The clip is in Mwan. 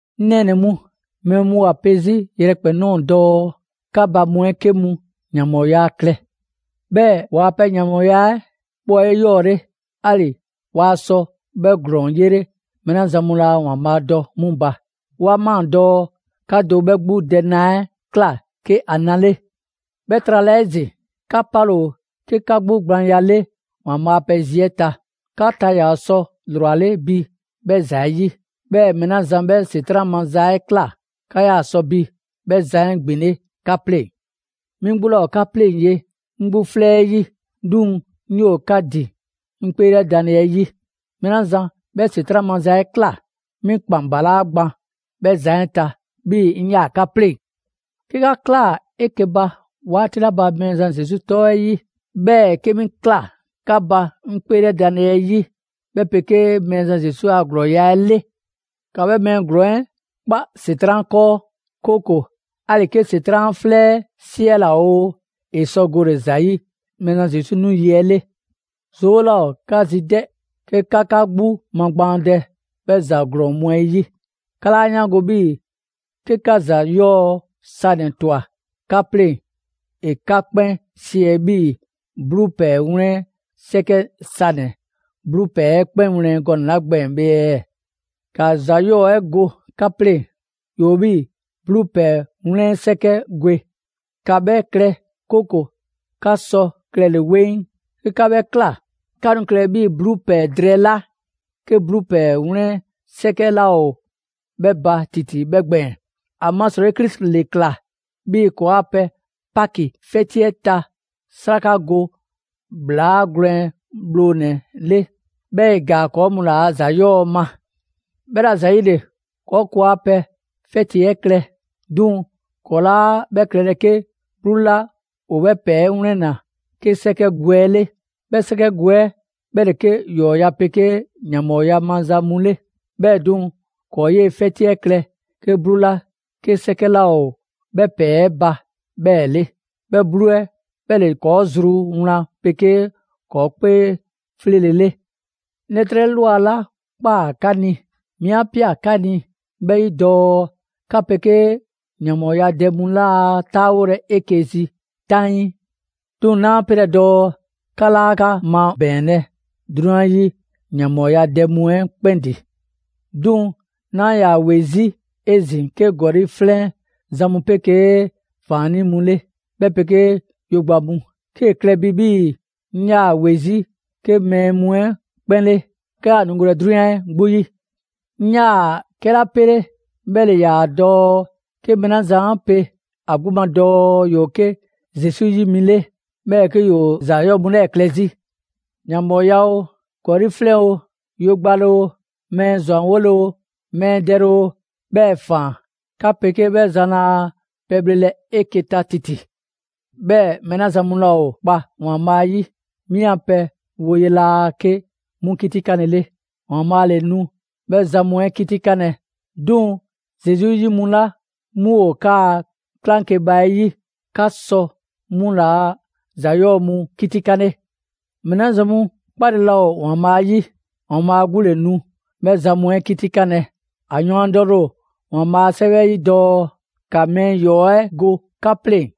'Ŋ nɛɛnɛ‑ mu, mɛɛ mu ‑o ‑a pe 'zi yrɛkpɛn‑ ꞊nɔɔ dɔɔ 'ka ba mu 'ɛ 'ke mu ‑yanbhɔɔya klɛ. 'Bhɛɛ‑ ‑waa' pɛ ‑yanbhɔɔya 'ɛ 'bhɛ ‑o 'eyɔɔle, 'ali‑ waa sɔ 'bhɛ ‑glɔɔn 'yele mɛɛ 'la zan mu laa ‑Waanbhaa' dɔ 'mu ba. 'Wa ꞊maa dɔɔ 'ka do 'bhɛ 'gbu dɛ na 'ɛ ꞊kla 'ke ‑a na 'le. 'Bhɛ trala 'ezin‑, 'ka 'pale‑ ‑o 'ke 'gbu gblaanya 'le ‑Waanbhaa' a pɛ zi 'ɛ ta. 'Ka ta ‑yaa sɔ ‑lrwale' bi 'bhɛ ‑za 'ɛ 'yi. 'Bhɛɛ‑ mɛɛ 'la zan 'bhɛ ‑Setran' maza 'ɛ ꞊kla, 'ka 'yaa‑ sɔ bi 'bhɛ zan 'ɛ ‑gbinle' 'ka 'pleŋ‑. 'Mi 'gbu 'laa ‑o 'ka 'pleŋ‑ ye 'ŋ 'gbu 'flɛ 'yi, 'duŋ‑ 'ŋ 'yoo‑ 'ka ‑din 'ŋ 'kpeelɛdanle 'ɛ 'yi. 'Mɛɛ 'la zan 'bhɛ ‑Setran' maza 'ɛ ꞊kla, 'mi ‑kpan ‑balaa' gban 'bhɛ zan 'ɛ ta, 'bhii‑ 'ŋ 'yaa‑ 'ka 'pleŋ‑. 'Ke 'ka ꞊klaa 'eke‑ ba 'waati 'la ba Mɛɛzan Zesu 'tɔ 'ɛ 'yi, 'bhɛɛ‑ 'ke 'mi ꞊kla 'ka ba 'ŋ 'kpeelɛdanle 'ɛ 'yi, 'bhɛ 'pegee Mɛɛzan Zesu a ‑glɔɔya' 'ɛ 'le; ‑ka 'bhɛ mɛɛ ‑glɔɔn 'ɛ 'kpa ‑Setran' 'kɔɔ, 'kooko‑ 'ali‑ 'ke ‑Setran' ‑a 'flɛ 'ɛ 'siɛla‑ oo, ‑e sɔ gole‑ ‑za 'yi Mɛɛzan Zesu 'nu yi 'ɛ 'le. 'Zoo 'laa ‑o 'ka zi 'dɛ 'ke 'ka 'ka 'gbu magbaandɛ 'bhɛ ‑za ‑glɔɔn 'ɛ 'yi! 'Ka 'laa 'yaango‑ 'bhii‑ 'ke 'ka ‑za 'yɔɔ‑ sanɛ‑ ꞊twa 'ka 'pleŋ‑, ‑e 'ka 'kpɛn 'siɛ 'bhii‑ 'bluu ‑pɛɛ 'wlɛn 'sɛkɛ sanɛ‑ 'bluu ‑pɛɛ 'ɛ 'kpɛn wlɛn gɔnɛ‑ 'la gbɛɛn‑ bhe ɛɛ? ‑Ka ‑za 'yɔɔ‑ 'ɛ go 'ka 'pleŋ‑, ‑yoo 'bhii‑ 'bluu ‑pɛɛ 'wlɛn 'sɛkɛ gwe; ‑ka 'bhɛ klɛ 'kooko‑ 'ka sɔ klɛle‑ 'weŋ. 'Ke 'ka 'bhɛ ꞊kla, 'ka nu klɛlɛ 'bhii‑ 'bluu ‑pɛɛ drɛɛ 'la 'ke 'bluu ‑pɛɛ 'wlɛn 'sɛkɛ laa ‑o 'bhɛ ba ‑titi 'bhɛ gbɛɛn‑. ‑Amasrɔyi Krisi ‑le ꞊kla 'bhii‑ ‑kɔɔa' pɛ Paki 'fɛti 'ɛ ta 'sraka go ‑bhlaa gwlɛn bhlonɛ‑ 'ɛ 'le, 'bhɛɛ‑ ‑e ‑gaa ‑kɔɔ' mu ‑laa' ‑za 'yɔɔ‑ ma. 'Bhɛla‑ ‑zayile, ‑kɔɔ' ‑kɔɔa' pɛ 'fɛti 'ɛ klɛ, 'duŋ‑ ‑kɔɔ' 'laa 'bhɛ klɛlɛ 'ke 'bluu 'la ‑o 'bhɛ ‑pɛɛ 'ɛ 'wlɛnna‑ 'ke 'sɛkɛ gwe 'ɛ 'le. 'Bhɛ 'sɛkɛ gwe 'ɛ 'bhɛ ‑le 'ke ‑yɔɔya' 'pegee ‑yanbhɔɔya maza mu 'le. 'Bhɛɛ‑ 'duŋ‑, ‑kɔɔ' 'yee‑ 'fɛti 'ɛ klɛ 'ke 'bluu 'la 'ke 'sɛkɛ 'laa ‑o 'bhɛ ‑pɛɛ 'ɛ ba 'bhɛɛ‑ 'le: 'bhɛ 'bluu 'ɛ 'bhɛ ‑le ‑kɔɔ' zru wlan 'pegee ‑kɔɔ' 'kpee 'fleele‑ 'le. 'Ŋ 'lɛtrɛ ꞊lwa 'la ꞊kpaa 'ka ni, 'mi 'a ꞊pia 'ka ni 'bhɛ 'yi dɔɔ 'ka 'pegee ‑yanbhɔɔyadɛ mu laa 'taawolɛ 'eke‑ zi 'taŋii. 'Duŋ‑ 'naa 'pelɛ‑ dɔɔ 'ka 'laa 'ka 'mabɛɛnlɛ 'drunyan 'yi ‑yanbhɔɔyadɛ mu 'ɛ 'kpɛn ‑din. 'Bhɛɛ‑ 'naa‑ ‑yaa ‑we 'zi 'ezin‑ 'ke ‑gɔli' 'flɛn zan mu 'pegee ‑faannii' mu 'le, 'bhɛ 'pegee yogba mu. 'Kee‑ klɛ bi 'bhii‑ 'ŋ 'yaa‑ ‑we 'zi 'ke 'bhɛ mɛɛ mu 'ɛ 'kpɛn 'le, 'ka 'yaa‑ nu golɛ 'drunyan 'ɛ 'gbu 'yi. 'Ŋ 'yaa‑ 'kɛla 'pele 'bhɛ ‑le ‑yaa dɔɔ 'ke mɛɛ 'la zan 'a pe ‑a 'gbu ma dɔɔ ‑yoo 'ke Zesu 'yi mi 'le, 'bhɛɛ‑ 'ke ‑yoo ‑za 'yɔɔ‑ mu 'lɛɛ‑ klɛ 'zi: ‑yanbhɔɔya oo, ‑gɔli' 'flɛn oo, yogbale oo, mɛɛ ‑zwanwole oo, ‑wɛɛn dɛle oo 'bhɛɛ‑ ‑faan. 'Ka 'pegee 'bhɛ zan laa pɛbhlelɛ 'eke‑ ta ‑titi. 'Bhɛɛ‑ mɛɛ 'la zan mu laa ‑o kpa ‑Waanbhaa' 'yi, 'mi 'an pɛ woye laa 'ke 'mu 'kitikanle 'le. ‑Waanbhaa' ‑le nu 'bhɛ zan mu 'ɛ 'kitikanlɛ. 'Duŋ‑ Zesu 'yi mu 'la 'mu ‑o 'kaa‑ 'klaŋkeba 'ɛ 'yi, 'ka sɔ 'mu ‑laa' ‑za 'yɔɔ‑ mu 'kitikanle. Mɛɛ 'la zan mu 'kpale‑ laa ‑o ‑Waanbhaa' 'yi, ‑Waanbhaa' 'gbu ‑le nu 'bhɛ zan mu 'ɛ 'kitikanlɛ. ‑A yɔɔndɛle ‑o ‑Waanbhaa' a 'Sɛwɛ 'ɛ 'yi dɔɔ: «‑Ka mɛɛ 'yɔɔ‑ 'ɛ go 'ka 'pleŋ‑.»